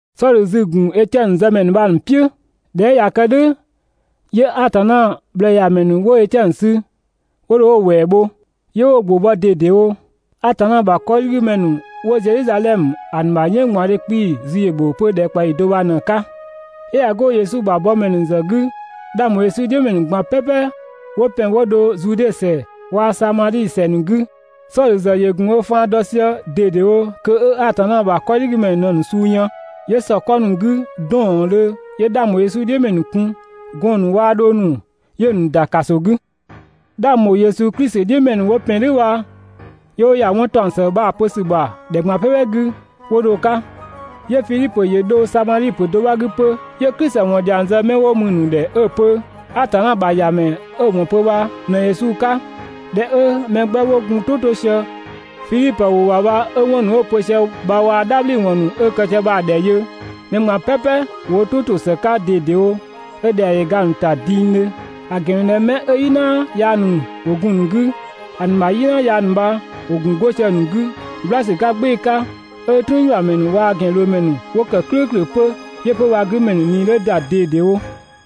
Sɔdhö zü‑ ‑gun Etiɛnö zëmɛ ‑nu bha‑ ‑nu "piʋ̈. ꞊Dhɛ 'ö ꞊ya kë "dhʋ̈, 'yö Atanna ꞊bhlëëyamɛ ‑nu 'wo Etiɛnö sü 'wo dho 'wo‑ ‑wɛɛ bho, 'yö 'wo‑ ‑gbʋ bɔ ꞊dedewo. Atanna ‑bha 'kɔdhigümɛ ‑nu 'wo Zedhizadhɛmö ‑a ‑nu ‑bha "yënnggbaɔndhe 'kpii‑ zü ‑yö ‑bho 'pö ‑dhɛkpaɔyi do bha ꞊në‑ 'ka. 'Yö ꞊ya 'go Yesu ‑bha bɔmɛ ‑nu ‑zë 'gü, 'dhang ‑bho Yesu "dhiʋ̈ ‑mɛ ‑nu ꞊gban "pɛpɛ 'wo ‑pɛn 'wo dho Zude ‑sɛ waa‑ Samadhi ‑sɛ ‑nu 'gü. Sɔdhö ‑zë ‑yö ‑gun ö faan dɔ sië ꞊dedewo kö 'ö Atanna ‑bha 'kɔdhigümɛ ‑nu ꞊në‑ ‑nu suu yën, 'yö ‑sɔ 'kɔ ‑nu 'gü 'dɔɔndhö 'yö 'dhang ‑bho Yesu "dhiʋ̈ ‑mɛ ‑nu kun, gɔɔn‑ ‑nu waa dhong ‑nu, 'yö‑ ‑nu ‑da ‑kaso 'gü. 'Dhang ‑bho Yesu Klisi "dhiʋ̈ ‑mɛ ‑nu 'wo ‑pɛn "dhʋ̈ bha, 'yö 'wo 'wɔn ‑taɔng ‑së bha‑ pö ‑dhɛ ꞊gban "pɛpɛ 'gü 'wo dho‑ 'ka. 'Yö Fidhipö ‑yö ‑dho Samadhi ‑pö do 'bha 'gü 'pö, 'yö Klisi ‑wɔn dhiang zë 'mɛ 'wo mü‑ ‑nu ‑dhɛ 'ö‑ pö Atanna ‑bha ‑Yamɛ 'ö‑ ‑wɔn pö bha ꞊në Yesu 'ka. ꞊Dhɛ 'ö mɛ 'gbɛ 'wo gun wo "tʋ 'to sië Fidhipö ‑wʋ ‑bha bha 'wo 'wɔn ‑nu 'ö‑ pö sië bha waa‑ "dhabhliwɔn ‑nu 'ö‑ kë sië bha‑ ‑dhɛ yö, mɛ ꞊gban "pɛpɛ ‑wo wo "tʋ to ‑së 'ka ꞊dedewo 'ö ‑dhɛa ‑yö ga‑ ‑nu ‑ta dingdhö; ‑a ‑gɛn ‑mü ꞊dhɛ 'mɛ 'ö "yina yaa ‑nu gun‑ ‑nu 'gü, ‑a ‑nu ‑bha "yina yaa ‑nu bha ‑wo gun 'go sië‑ ‑nu 'gü "gbla ‑sü 'ka "gbɩɩ‑ 'ka, 'ö "trüünyuamɛ ‑nu waa‑ ‑gɛnloomɛ ‑nu 'wo ‑kë "klʋ̈ʋ̈klʋ̈ 'pö. 'Yö 'pö‑ bha‑ 'gümɛ ‑nu ꞊nii 'dhö ‑da ꞊dedewo.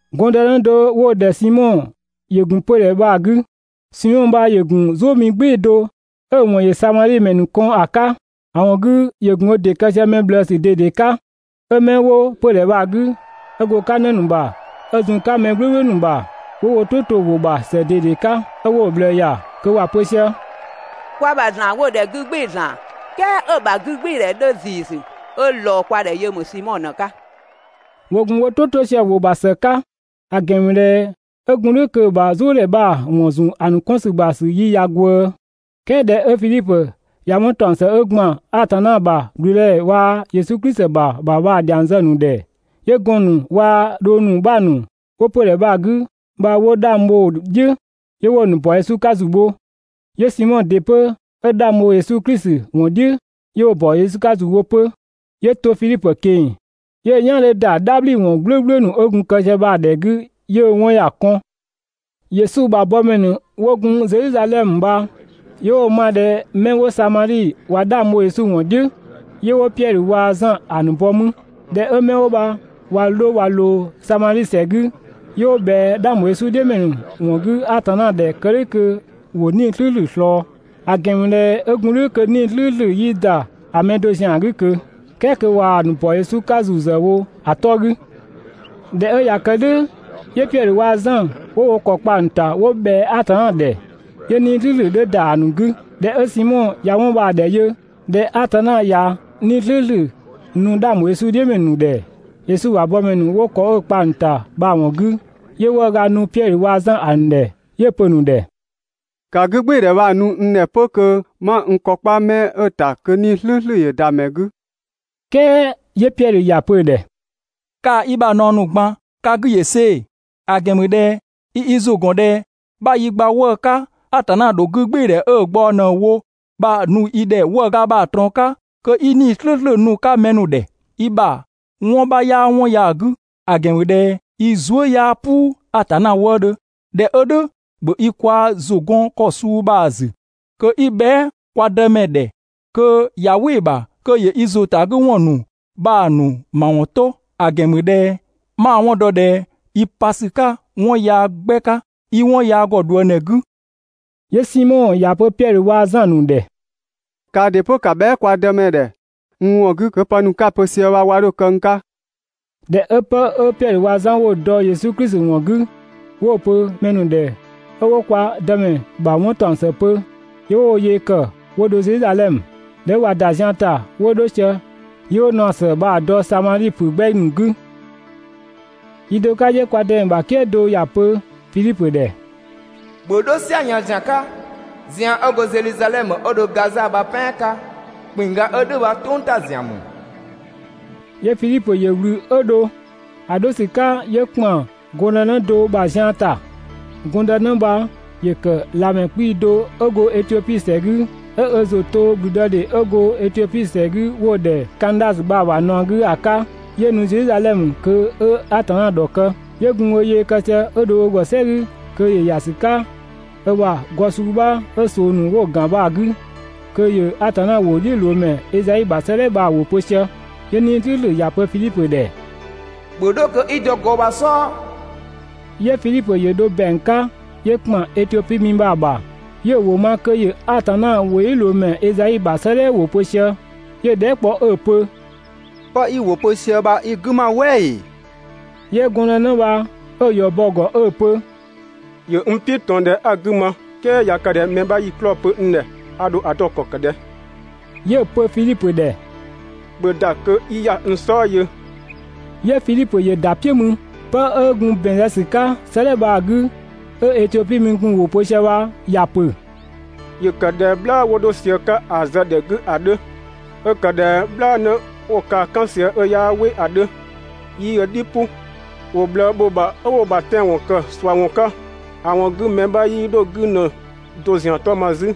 Gɔndënë do 'wo‑ ‑dhɛ Simɔ ‑yö ‑gun 'pödhɛ bha‑ 'gü. Simɔ bha ‑yö ‑gun "zʋʋmi "gbɩɩ‑ do 'ö‑ ‑wɔn ‑yö Samadhi ‑mɛ ‑nu kɔn ‑a 'ka. ‑A ‑wɔn 'gü ‑yö ‑gun ö ‑dɩ kë sië mɛ ꞊bhlëësü ꞊dede 'ka. 'Ö 'mɛ 'wo 'pödhɛ bha‑ 'gü, 'ö go‑ 'ka 'në ‑nu ‑bha ö zun‑ 'ka mɛ "gblʋ̈gblʋ̈ ‑nu ‑bha, 'wo wo "tʋ to‑ ‑wʋ ‑bha ‑së ꞊dede 'ka 'ö 'wo‑ ꞊bhlëë ‑ya, kö ‑wa pö sië: «Kwa ‑bha ‑zlan 'wo‑ ‑dhɛ «'gü "gbɩɩ‑ ‑zlan» "kɛɛ 'ö‑ ‑bha 'gügbɩɩdhɛ 'dhö ‑ziisü, 'ö ꞊lɔɔ kwa ‑dhɛ yö ‑mü Simɔ ꞊në‑ 'ka.» ‑Wo ‑gun wo "tʋ 'to sië‑ ‑wʋ ‑bha ‑së 'ka, ‑a ‑gɛn ‑mü ꞊dhɛ 'ö gun "dhʋ̈ kö‑ ‑bha "zʋʋdhɛ bha‑ ‑wɔn ‑zun ‑a ‑nu 'kɔn ‑sü ‑bha ‑yi ꞊ya ꞊gwëë. "Kɛɛ ꞊dhɛ 'ö Fidhipö ꞊ya 'wɔn ‑taɔng ‑së 'ö ‑gban Atanna ‑bha ‑gblüdëdhɛ waa‑ Yesu Klisi ‑bha bha‑ ‑dhiang zë‑ ‑nu ‑dhɛ, 'yö gɔɔn‑ ‑nu waa‑ dhong ‑nu 'bha ‑nu 'wo 'pödhɛ bha‑ 'gü bha 'wo 'dhang bho‑ "dhiʋ̈, 'yö 'wo‑ ‑nu ‑bɔ Yesu 'ka ‑zu bho. 'Yö Simɔ ‑dɩ 'pö 'ö 'dhang bho Yesu Klisi ‑wɔn "dhiʋ̈, 'yö 'wo‑ ‑bɔ 'ka ‑zu bho 'pö. 'Yö to Fidhipö ꞊keng‑ 'yö‑ "yan 'dhö ‑da "dhabhliwɔn "gblʋ̈gblʋ̈ ‑nu 'ö gun‑ kë sië bha‑ ‑dhɛ 'gü, 'yö‑ 'wɔn ‑ya kɔn. Yesu ‑bha bɔmɛ ‑nu 'wo gun Zedhizadhɛmö bha, 'yö 'wo‑ ma ꞊dhɛ 'mɛ 'wo Samadhi ꞊wa 'dhang bho Yesu ‑wɔn "dhiʋ̈, 'yö 'wo Piɛdhö waa‑ Zan ‑a ‑nu bɔ mü. ꞊Dhɛ 'ö 'mɛ 'wo bha ꞊wa 'dho ꞊wa ꞊loo Samadhi ‑sɛ 'gü, 'yö 'wo ꞊bhɛa 'dhang ‑bho Yesu "dhiʋ̈ ‑mɛ ‑nu ‑wɔn 'gü Atanna ‑dhɛ kë "dhʋ̈ kö ‑wo 'Nii‑ "slʋ̈ʋ̈slʋ̈ ꞊slɔɔ. ‑A ‑gɛn ‑mü ꞊dhɛ 'ö gun "dhʋ̈ kö 'Nii‑ "slʋ̈ʋ̈slʋ̈ 'yii ‑da ‑a mɛ do ‑zian 'gü ꞊kö, "kɛɛ kö ꞊waa‑ ‑nu ‑bɔ Yesu 'ka ‑zu ‑zë wo ‑a 'tɔ 'gü. ꞊Dhɛ 'ö ꞊ya kë "dhʋ̈, 'yö Piɛdhö waa‑ Zan 'wo wo ‑kɔ kpa‑ ‑nu ‑ta 'wo ꞊bhɛa Atanna ‑dhɛ, 'yö 'Nii‑ "slʋ̈ʋ̈slʋ̈ 'dhö ‑da ‑a ‑nu 'gü. ꞊Dhɛ 'ö Simɔ ꞊ya 'wɔn bha‑ ‑dhɛ yö, ꞊dhɛ Atanna ꞊ya 'Nii‑ slʋ̈ʋ̈slʋ̈ nu 'dhang ‑bho Yesu "dhiʋ̈ ‑mɛ ‑nu ‑dhɛ, Yesu ‑bha bɔmɛ ‑nu 'wo ‑kɔ 'ö‑ kpa‑ ‑nu ‑ta bha‑ ‑wɔn 'gü, 'yö 'wëëga nu Piɛdhö waa‑ Zan ‑a ‑nu ‑dhɛ 'yö‑ pö‑ ‑nu ‑dhɛ: «‑Ka 'gügbɩɩdhɛ bha‑ nu n ‑dhɛ 'pö kö 'ma n ‑kɔ kpa 'mɛ 'ö‑ ‑ta, kö 'Nii‑ "slʋ̈ʋ̈slʋ̈ ‑yö ‑da ‑mɛ 'gü!» "Kɛɛ 'yö Piɛdhö ‑ya pö‑ ‑dhɛ: «Kaa‑ i ‑bha ꞊naɔ ‑nu ꞊gban, ‑ka 'gü ‑yö see‑! ‑A ‑gɛn ‑mü ꞊dhɛ i i ‑zʋ ‑gɔn ꞊dhɛ 'bha yi gba 'wëë‑ 'ka Atanna dho 'gügbɩɩdhɛ 'ö‑ ꞊gbaɔ ꞊në‑ wo bha‑ nu i ‑dhɛ 'wëëga bha‑ ꞊trɔɔn 'ka kö 'i 'Nii‑ "slʋ̈ʋ̈slʋ̈ nu‑ 'ka mɛ ‑nu ‑dhɛ. i ‑bha 'wɔn 'bha 'yaa 'wɔn ya‑ 'gü, ‑a ‑gɛn ‑mü ꞊dhɛ i zuë" 'yaa "puu Atanna wëëdhö. ꞊Dhɛ 'ö "dhʋ̈, ‑bhö i kwaa‑ ‑zʋ 'gɔn ‑kɔ suu bha‑ ‑zü kö 'i bhɛa" kwa Dëmɛ ‑dhɛ kö ꞊ya "wɩ‑ ‑bha kö ‑yö i ‑zʋtagüwɔn ‑nu bha‑ ‑nu ‑mawɔn 'to, ‑a ‑gɛn ‑mü ꞊dhɛ 'ma‑ 'wɔn dɔ ꞊dhɛ i pa ‑sü 'ka 'wɔn yaa 'gbɛ 'ka, 'i 'wɔn yaa ‑gɔ ꞊dhuëngdhɛ 'gü.» 'Yö Simɔ ‑ya pö Piɛdhö waa‑ Zan‑ ‑nu ‑dhɛ: «Kaa ‑dɩ 'pö, ‑ka bhɛa" kwa Dëmɛ ‑dhɛ n ‑wɔn 'gü kö pë ‑nu 'ka‑ pö sië bha 'wa 'dho kë n 'ka!» ꞊Dhɛ 'ö 'pë 'ö Piɛdhö waa‑ Zan 'wo‑ dɔ Yesu Klisi ‑wɔn 'gü, 'wo‑ pö mɛ ‑nu ‑dhɛ 'ö 'wo kwa Dëmɛ ‑bha 'wɔn ‑taɔng ‑së pö, 'yö 'wo wo yee ‑kë 'wo dho Zedhizadhɛmö. ꞊Dhɛ 'ö ꞊wa ‑da zian ‑ta 'wo 'dho sië, 'yö 'wo naɔ ‑së bha‑ dɔ Samadhi ‑pö 'gbɛ ‑nu 'gü. Yi do 'ka 'yö kwa Dëmɛ ‑bha "kië do ‑ya ‑pö Fidhipö ‑dhɛ: «‑Bhö 'dho "siayën ‑zian 'ka, zian 'ö go Zedhizadhɛmö 'ö dho Gaza bha‑ "pɛan 'ka! ‑Kpinngga 'ö "dhʋ̈ bha "tʋng ‑ta ‑zian ‑mü.» 'Yö Fidhipö ‑yö ꞊wlü 'ö dho. ‑A 'dho ‑sü 'ka 'yö ‑kpan gɔndënë do ‑bha zian ‑ta. Gɔndënë bha ‑yö ‑kë ꞊lamɛ 'kpii‑ do 'ö go Etiopi ‑sɛ 'gü, 'ö ö ‑zʋ to ‑gblüdëdhe 'ö go Etiopi ‑sɛ 'gü 'wo‑ ‑dhɛ Kandasö bha‑ ‑bha ꞊naɔ 'gü ‑a 'ka, 'yö nu Zedhizadhɛmö kö 'ö Atanna ‑dhɔkë. Yö gun ö yee kë sië 'ö dho ö ‑gɔ "sɛ 'gü kö ‑yö ‑ya ‑sü 'ka ö ‑bha gɔ suu 'bha 'ö ꞊soo ‑nu 'wo‑ ‑gan bha‑ 'gü kö ‑yö Atanna ‑wʋdhiʋ̈loomɛ Ezai ‑bha 'sëëdhɛ bha‑ ‑wʋ pö sië. 'Yö 'Nii‑ "slʋ̈ʋ̈slʋ̈ ‑ya pö Fidhipö ‑dhɛ: «‑Bhö 'dho kö 'i dɔ gɔ bha‑ "sɔɔ!» 'Yö Fidhipö ‑yö dho ‑bɛang 'ka 'yö ‑kpan Etiopi mi bha‑ ‑bha, 'yö‑ ‑wʋ ma kö ‑yö Atanna ‑wʋdhiʋ̈loomɛ Ezai ‑bha 'sëëdhɛ bha‑ ‑wʋ pö sië. 'Yö‑ dhɛɛ" kpɔ 'ö‑ pö: «'Pë 'i‑ ‑wʋ pö sië bha i‑ 'gü ‑ma "wɛ ‑ee?» 'Yö gɔndënë bha 'ö‑ ‑yɔ bɔ‑ ‑gɔ 'ö‑ pö: «(‑Yö n "piʋ̈ ꞊tɔn ꞊dhɛ 'a‑ 'gü ma "kɛɛ) ꞊ya kë ꞊dhɛ mɛ 'bha 'yii‑ 'klɔɔ‑ pö n ‑dhɛ, ‑a ‑dho ‑a dɔ ‑kɔ ‑kë ꞊dhɛ?» 'Yö‑ pö Fidhipö ‑dhɛ: «‑Bhö ‑da kö 'i ‑ya n "sɔɔ yö!» 'Yö Fidhipö ‑yö ‑da "piʋ̈ mü. 'Pë 'ö gun ‑bɛn zë ‑sü 'ka 'sëëdhɛ bha‑ 'gü 'ö Etiopi mi gun‑ ‑wʋ pö sië bha ‑ya ‑pö: «‑Yö ‑kë ꞊dhɛ "bhlaa 'wo 'dho sië‑ 'ka ‑a zë ‑dhɛ 'gü ‑a 'dhö. 'Ö ‑kë ꞊dhɛ "bhlaanë 'wo‑ kaa‑ "kan sië 'ö 'yaa "wɩ ‑a 'dhö, 'yii ö "dhi "pʋ. ‑Wo ꞊bhlëë ‑bho ‑bha 'ö 'wo‑ ‑bha tɛanwɔn ‑kë ꞊suawɔn 'ka, ‑a ‑wɔn 'gü mɛ 'bha 'yii 'dho‑ 'gü ‑në do ‑zian 'tɔ ma 'zü,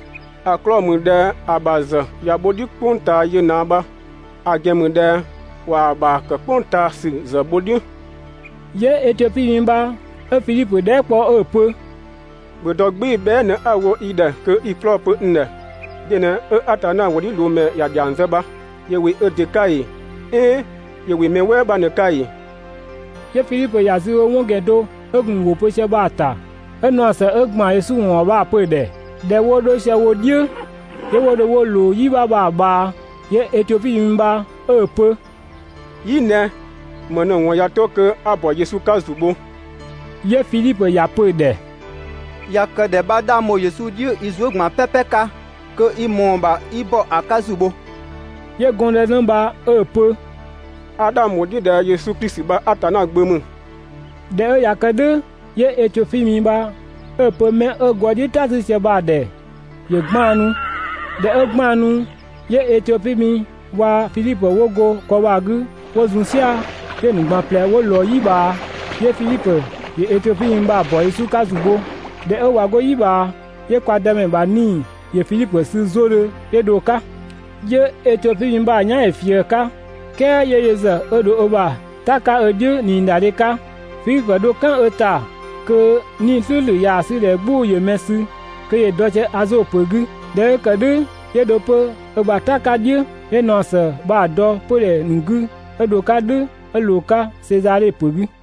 ‑a 'klɔɔ‑ ‑mü ꞊dhɛ ‑a ‑bha ‑bha ‑zë ꞊ya bho‑ "dhiʋ̈ "kpʋng ꞊taa yö ꞊naa bha, ‑a ‑gɛn ‑mü ꞊dhɛ ꞊waa‑ ‑bha ‑kë "kpʋng ꞊taa ‑sü ‑zë bho‑ "dhiʋ̈.» 'Yö Etiopi mi bha 'ö Fidhipö dhɛɛ" kpɔ 'ö‑ pö: «‑Bhö dɔ "gbɩɩ‑ bhɛa" ꞊në 'a‑ wo i ‑dhɛ kö 'i‑ 'klɔɔ‑ pö n ‑dhɛ. De ꞊në 'ö Atanna ‑wʋdhiʋ̈loomɛ ‑ya ‑dhiang zë bha? ‑Yö ‑wɩ ö ‑dɩ 'ka ‑ee, "ɛɛn ‑yö ‑wɩ mɛ "wɛɛ 'bha ꞊në‑ 'ka ‑ee?» 'Yö Fidhipö ‑ya zü bho 'wɔn ‑gɛn do ö gun‑ ‑wʋ pö sië bha‑ ‑ta 'ö naɔ ‑së 'ö ‑gban Yesu ‑wɔn ‑bha bha‑ pö‑ ‑dhɛ. ꞊Dhɛ 'wo 'dho sië wo "dhiʋ̈, 'yö 'wo dho 'wo ꞊loo "yi 'bha bha‑ ꞊bhaa, 'yö Etiopi mi bha 'ö‑ pö: «"Yi ꞊nɛ, ‑më ꞊në‑ ‑wɔn ꞊ya 'to kö 'a ‑bɔ Yesu 'ka ‑zu bho?» 'Yö Fidhipö ‑ya pö‑ ‑dhɛ: «꞊Ya kë ꞊dhɛ 'bha 'dhang bho Yesu "dhiʋ̈ i zuë" ꞊gban "pɛpɛ 'ka kö i ‑mɔɔ ‑bha 'i ‑bɔ ‑a 'ka ‑zu bho.» 'Yö gɔndënë bha 'ö‑ pö: «A 'dhang ‑bho "dhiʋ̈ ꞊dhɛ Yesu Klisi bha Atanna Gbö ‑mü.» ꞊Dhɛ 'ö ꞊ya kë "dhʋ̈, 'yö Etiopi mi bha 'ö‑ pö 'mɛ 'ö gɔ bha‑ "dhiʋ̈ "ta 'sü sië bha‑ ‑dhɛ ‑yö 'gbaannu. ꞊Dhɛ 'ö 'gbaannu, 'yö Etiopi mi waa‑ Fidhipö 'wo go gɔ bha‑ 'gü 'wo zun "sia‑, 'yö‑ ‑nu ꞊gban ꞊plɛ 'wo ꞊lɔɔ "yi ꞊bhaa. 'Yö Fidhipö ‑yö Etiopi mi bha‑ ‑bɔ Yesu 'ka ‑zu bho. ꞊Dhɛ 'ö ꞊wa 'go "yi ꞊bhaa, 'yö kwa Dëmɛ ‑bha 'Nii‑ ‑yö Fidhipö sü 'zodhö 'yö dho‑ 'ka. 'Yö Etiopi mi bha‑ "yan ‑yö ꞊fië‑ 'ka, "kɛɛ 'yö yö ‑zë 'ö dho ö ‑bha "ta 'ka ö "dhiʋ̈ ꞊niidadhe 'ka. Fidhipö dho "kan ö ‑ta (kö 'Nii‑ "slʋ̈ʋ̈slʋ̈ ꞊yaa‑ 'sü ꞊dhɛ 'gbʋ‑ ‑yö mɛ sü,) kö ‑yö dɔ sië Azo ‑pö 'gü. ꞊Dhɛ 'ö ‑kë "dhʋ̈ 'yö dho 'pö ö ‑bha "ta 'ka "dhiʋ̈, 'yö naɔ ‑së bha‑ dɔ 'pödhɛ ‑nu 'gü 'ö dho‑ 'ka "dhʋ̈ 'ö ꞊loo‑ 'ka Sezadhe ‑pö 'gü.